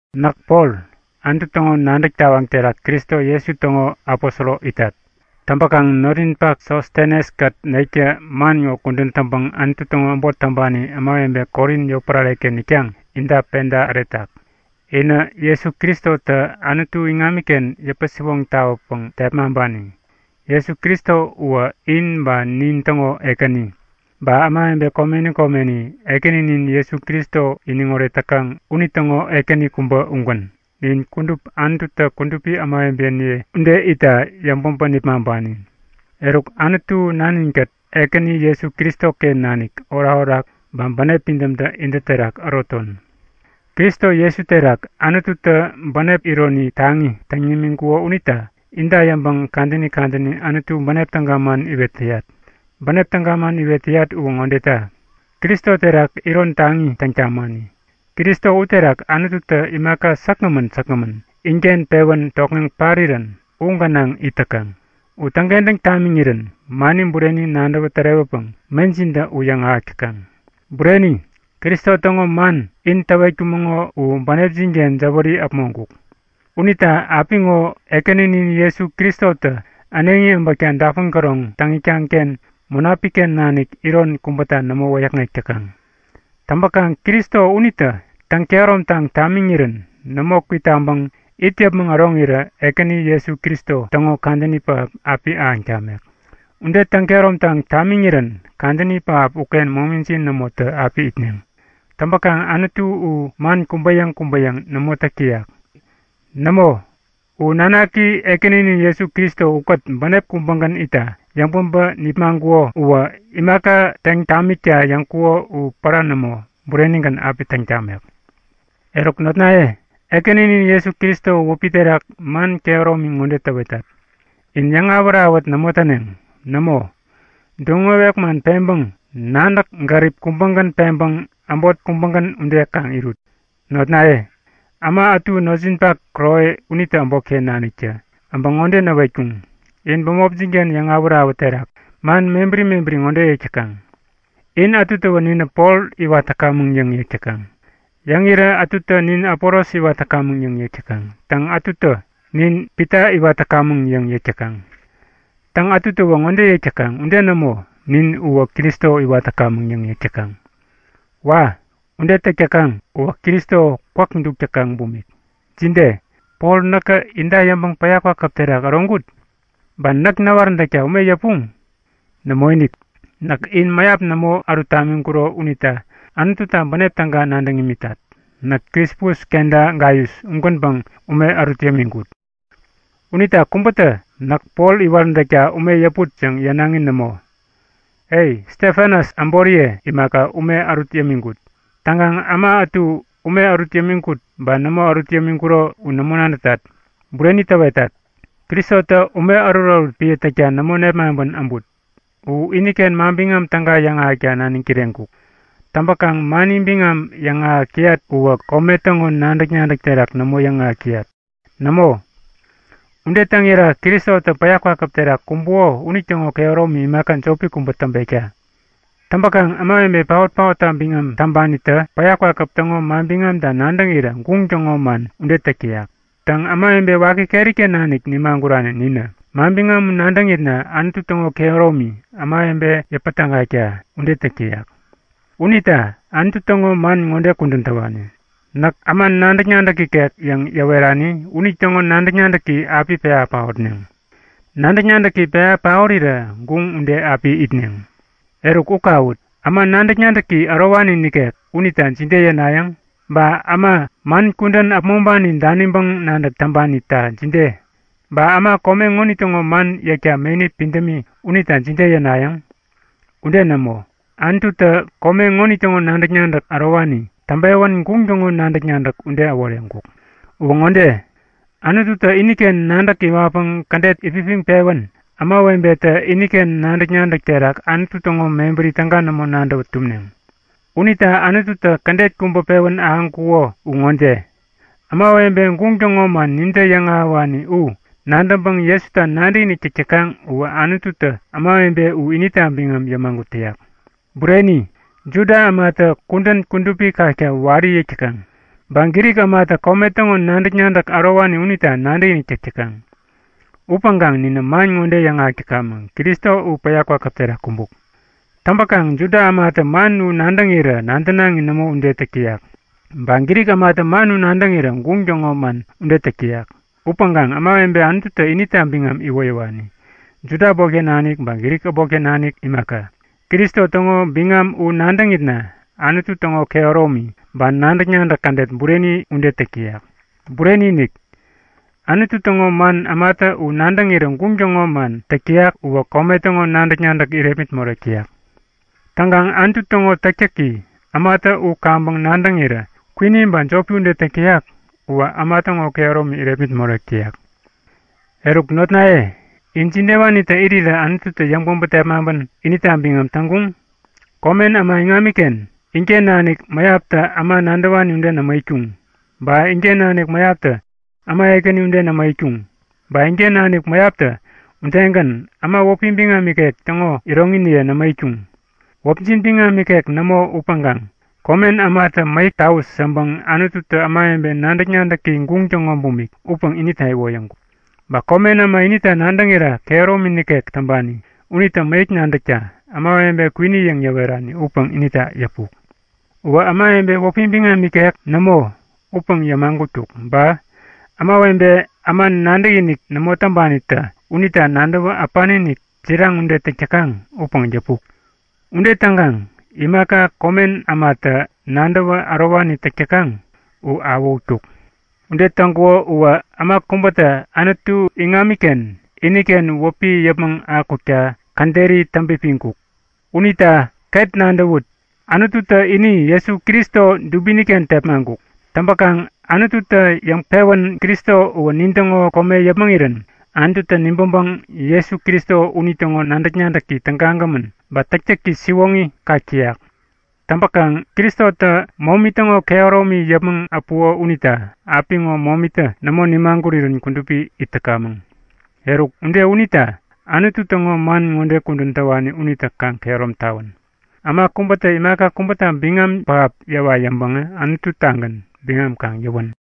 Näk Pol, Anutu täŋo nadäk tawaŋ terak Kristo Jesu täŋo aposoro itat. Täŋpäkaŋ notninpak Sostenes-kät nektä man ŋo kudän täŋpäŋ Anutu täŋo äbot täŋpani ämawebe Korin yotpärare-ken itkaŋ inta peda äretak. Inä Jesu Kristotä Anutu iŋamiken yäpän-siwoŋ tawäpäŋ tepmaŋpani. Jesu Kristo uwä in ba nintäŋo Ekäni, ba ämawebe komeni komeni Ekäninin Jesu Kristo iniŋoret täkaŋ unitäŋo Ekäni kubä ugän. Nin kudup Anututä kudupi ämawebeniye ude itta yäŋpäbä nipmaŋpani. Eruk Anutu Nanin-kät Ekäni Jesu Kristoken nanik orakorak ba bänep pidämtä intä terak äroton. Kristo Jesu terak Anututä bänep iron taŋi täŋ tamiŋkuko unita inta yäŋpäŋ kadäni kadäni Anutu bänep täga man iwet täyat. Bänep täga man iwet täyat uwä ŋodeta; Kristo terak iron taŋi täŋ tamani. Kristo uterak Anututä imaka säkgämän säkgämän inken pewän tokŋeŋ parirän u gänaŋ it täkaŋ. U täŋkentäŋ tamiŋirän mani bureni nadäwä tärewäpäŋ mejintä u yäŋahäk täkaŋ. Bureni! Kristo täŋo man in täwetkumäŋo u bänepjin-ken jäwäri äpmoŋkuk. Unita apiŋo Ekäninin Jesu Kristotä äneŋi äbäkta dapun käroŋ täŋ itkaŋ-ken Munapik-ken nanik iron kubäta nämo wäyäkŋek täkaŋ. Täŋpäkaŋ Kristo unitä täŋ-kehäromtaŋ tamiŋirän nämo kwitaŋpäŋ it yäpmäŋ äroŋirä Ekäni Jesu Kristo täŋo kadäni pähap api ahäŋ tamek. Ude täŋ-kehäromtaŋ tamiŋirän kadäni pähap uken momijin nämotä api itneŋ. Täŋpäkaŋ Anutu u man kubä-yäŋ kubä-yäŋ nämo täk täyak. Nämo, u nanaki Ekäninin Jesu Kristo ukät bänep kubägän itta yäŋpäbä nipmaŋkuko uwä imaka täŋ tamikta yäŋkuko u pära nämo, burenigän api täŋ tamek. Eruk notnaye, Ekäninin Jesu Kristo wäpi terak man kehäromi ŋode täwetat; In yäŋawät-awät nämo täneŋ. Nämo, duŋ-wewek man peŋpäŋ nadäk-gärip kubägän peŋpäŋ äbot kubägän ude kaŋ irut. Notnaye, äma ätu notjinpak Kloe unitä äbotken naniktä äbä ŋode näwetkuŋ; In bämopjin-ken yäŋawät-awät terak man mebäri mebäri ŋode yäk täkaŋ; In ätutä Ninä Pol iwat täkamäŋ yäŋ yäk täkaŋ. Yäŋirä ätutä Nin Apolos iwat täkamäŋ yäŋ yäk täkaŋ. Täŋ, ätutä Nin Pita iwat täkamäŋ yäŋ yäk täkaŋ. Täŋ, ätutäwä ŋode yäk täkaŋ; Ude nämo, nin uwä Kristo iwat täkamäŋ yäŋ yäk täkaŋ. Wa! Ude täk täkaŋ uwä Kristo kwäk duk täkaŋ bumik! Jide? Pol näkä inta yäŋpäŋ päya kwakäp terak äroŋkut? Ba näk näwaräntäkta ume yäpuŋ? Nämoinik, näk in mäyap nämo ärut tamiŋkuro unita Anututa bänep täga nadäŋ imitat. Näk Krispus kenta Gaius ugänpäŋ ume ärut yämiŋkut. Unita kubätä Näk Pol iwaräntäkta ume yäput yäŋ yänaŋi nämo. E, Stefanas äboriye imaka ume ärut yämiŋkut. Täŋkaŋ äma ätu ume ärut yämiŋkut ba nämo ärut yämiŋkuro u nämo nadätat. Bureni täwetat, Kristotä ume ärutärut piä täkta nämo nepmaŋpän äbut. U iniken Manbiŋam Täga yäŋahäkta naniŋ kireŋkuk. Täŋpäkaŋ mani biŋam yäŋahäk täyat uwä kome täŋo nadäk-nadäk terak nämo yäŋahäk täyat. Nämo, ude täŋira Kristotä päya kwakäp terak kumbuko unitäŋo kehäromi imaka jopi kubä täŋpekta. Täŋpäkaŋ ämawebe paot-paotta biŋam täŋpanitä päya kwakäp täŋo manbiŋamta nadäŋirä guŋ täŋo man ude täk täyak. Täŋ, ämawebe waki keri-ken nanik nimagurani ninä manbiŋam u nadäŋitna Anutu täŋo kehäromi, ämawebe yäpätägakta, ude täk täyak. Unita Anutu täŋo man ŋode kudän täwani; Näk äma nadäk-nadäk ikek yäŋ yäwerani unitäŋo nadäk-nadäki api pewa paotneŋ. Nadäk-nadäki pewa paorirä guŋ ude api itneŋ yäk. Eruk u kawut! Äma nadäk-nadäki ärowani nikek unita jide yänayäŋ? Ba äma man kudän äpmoŋpani daniŋpäŋ nadäk täŋpanita jide? Ba äma kome ŋonitäŋo man yäkta meni pidämi unita jide yänayäŋ? Ude nämo! Anututä kome ŋonitäŋo nadäk-nadäk ärowani täŋpewän guŋ täŋo nadäk-nadäk ude äworeŋkuk. Uwä ŋode; Anututä iniken nadäk iwatpäŋ kädet itpipiŋpewän ämawebetä iniken nadäk-nadäk terak Anutu täŋo mebäri täga nämo nadäwä tumneŋ. Unita Anututä kädet kubä pewän ahäŋkuko u ŋode; Ämawebe, guŋ täŋo man nintä yäŋahäwani u nadäŋpäŋ Jesuta nadäkinik täk täkaŋ uwä Anututä ämawebe u inita biŋam yämagut täyak. Bureni, Juda ämatä kudän kudupi kakta wari yäk täkaŋ, ba Grik ämatä kome täŋo nadäk-nadäk ärowani unita nadäkinik täk täkaŋ. Upäŋkaŋ ninä man ŋode yäŋahäk täkamäŋ; Kristo u päya kwakäp terak kumbuk! Täŋpäkaŋ Juda ämatä man u nadäŋirä nadänaŋi nämo ude täk täyak. Ba Grik ämatä man u nadäŋirä guŋ täŋo man ude täk täyak. Upäŋkaŋ ämawebe Anututä inita biŋam iwoyäwani, Juda äbotken nanik ba Grik äbotken nanik imaka, Kristo täŋo biŋam u nadäŋitna Anutu täŋo kehäromi ba nadäk-nadäk kädet bureni ude täk täyak. Bureni-inik, Anutu täŋo man ämatä u nadäŋirä guŋ täŋo man täk täyak uwä kome täŋo nadäk-nadäk irepmit morek täyak. Täŋkaŋ Anutu täŋo täktäki, ämatä u kaŋpäŋ nadäŋirä kwini ba jopi ude täk täyak uwä äma täŋo kehäromi irepmit morek täyak. Eruk notnaye, in jidewanitä irirä Anututä yäŋpäbä tepmaŋpän inita biŋam täŋkuŋ? Komen äma iŋamiken inken nanik mäyaptä äma nadäwani ude nämo itkuŋ. Ba inken nanik mäyaptä äma ekäni ude nämo itkuŋ. Ba inken nanik mäyaptä udegän, äma wäpi biŋam ikek täŋo iroŋiniye nämo itkuŋ. Wäpjin biŋam ikek nämo upäŋkaŋ komen ämatä mäyäk tawut yäŋpäŋ Anututä ämawebe nadäk-nadäki guŋ täŋo bumik upäŋ inita iwoyäŋkuk. Ba komen äma inita nadäŋirä kehäromi nikek täŋpani unitä mäyäk nadäkta, ämawebe kwini yäŋ yäwerani upäŋ inita yäpuk. Uwä ämawebe wäpi biŋam ikek nämo, upäŋ yämagutkuk, ba ämawebe äma nadäkinik nämo täŋpanitä unita nadäwä äpani-inik, jiraŋ ude täk täkaŋ upäŋ yäpuk. Ude täŋkaŋ imaka komen ämatä nadäwä ärowani täk täkaŋ u awähutkuk. Ude täŋkuko uwä äma kubätä Anutu iŋamiken iniken wäpi yäpmäŋ akukta käderi täŋpipiŋkuk. Unita ket ŋode nadäwut! Anututä ini Jesu Kristo dubini-ken tepmaŋkuk. Täŋpäkaŋ Anututä yäŋpewän Kristo uwä nintäŋo kome yäpmäŋirän Anututä nibäŋpäŋ Jesu Kristo unitäŋo nadäk-nadäki tägagämän ba täktäki siwoŋi kak täyak. Täŋpäkaŋ, Kristotä momi täŋo kehäromi yäpmäŋ äpuko unita apiŋo momitä nämo nimagurirän kudupi it täkamäŋ. Eruk, ude unita Anutu täŋo man ŋode kudän täwani unitä kaŋ kehärom tawän; Äma kubätä imaka kubäta biŋam pähap yäwa yäŋpäŋä Anutu-tagän biŋam kaŋ yäwän.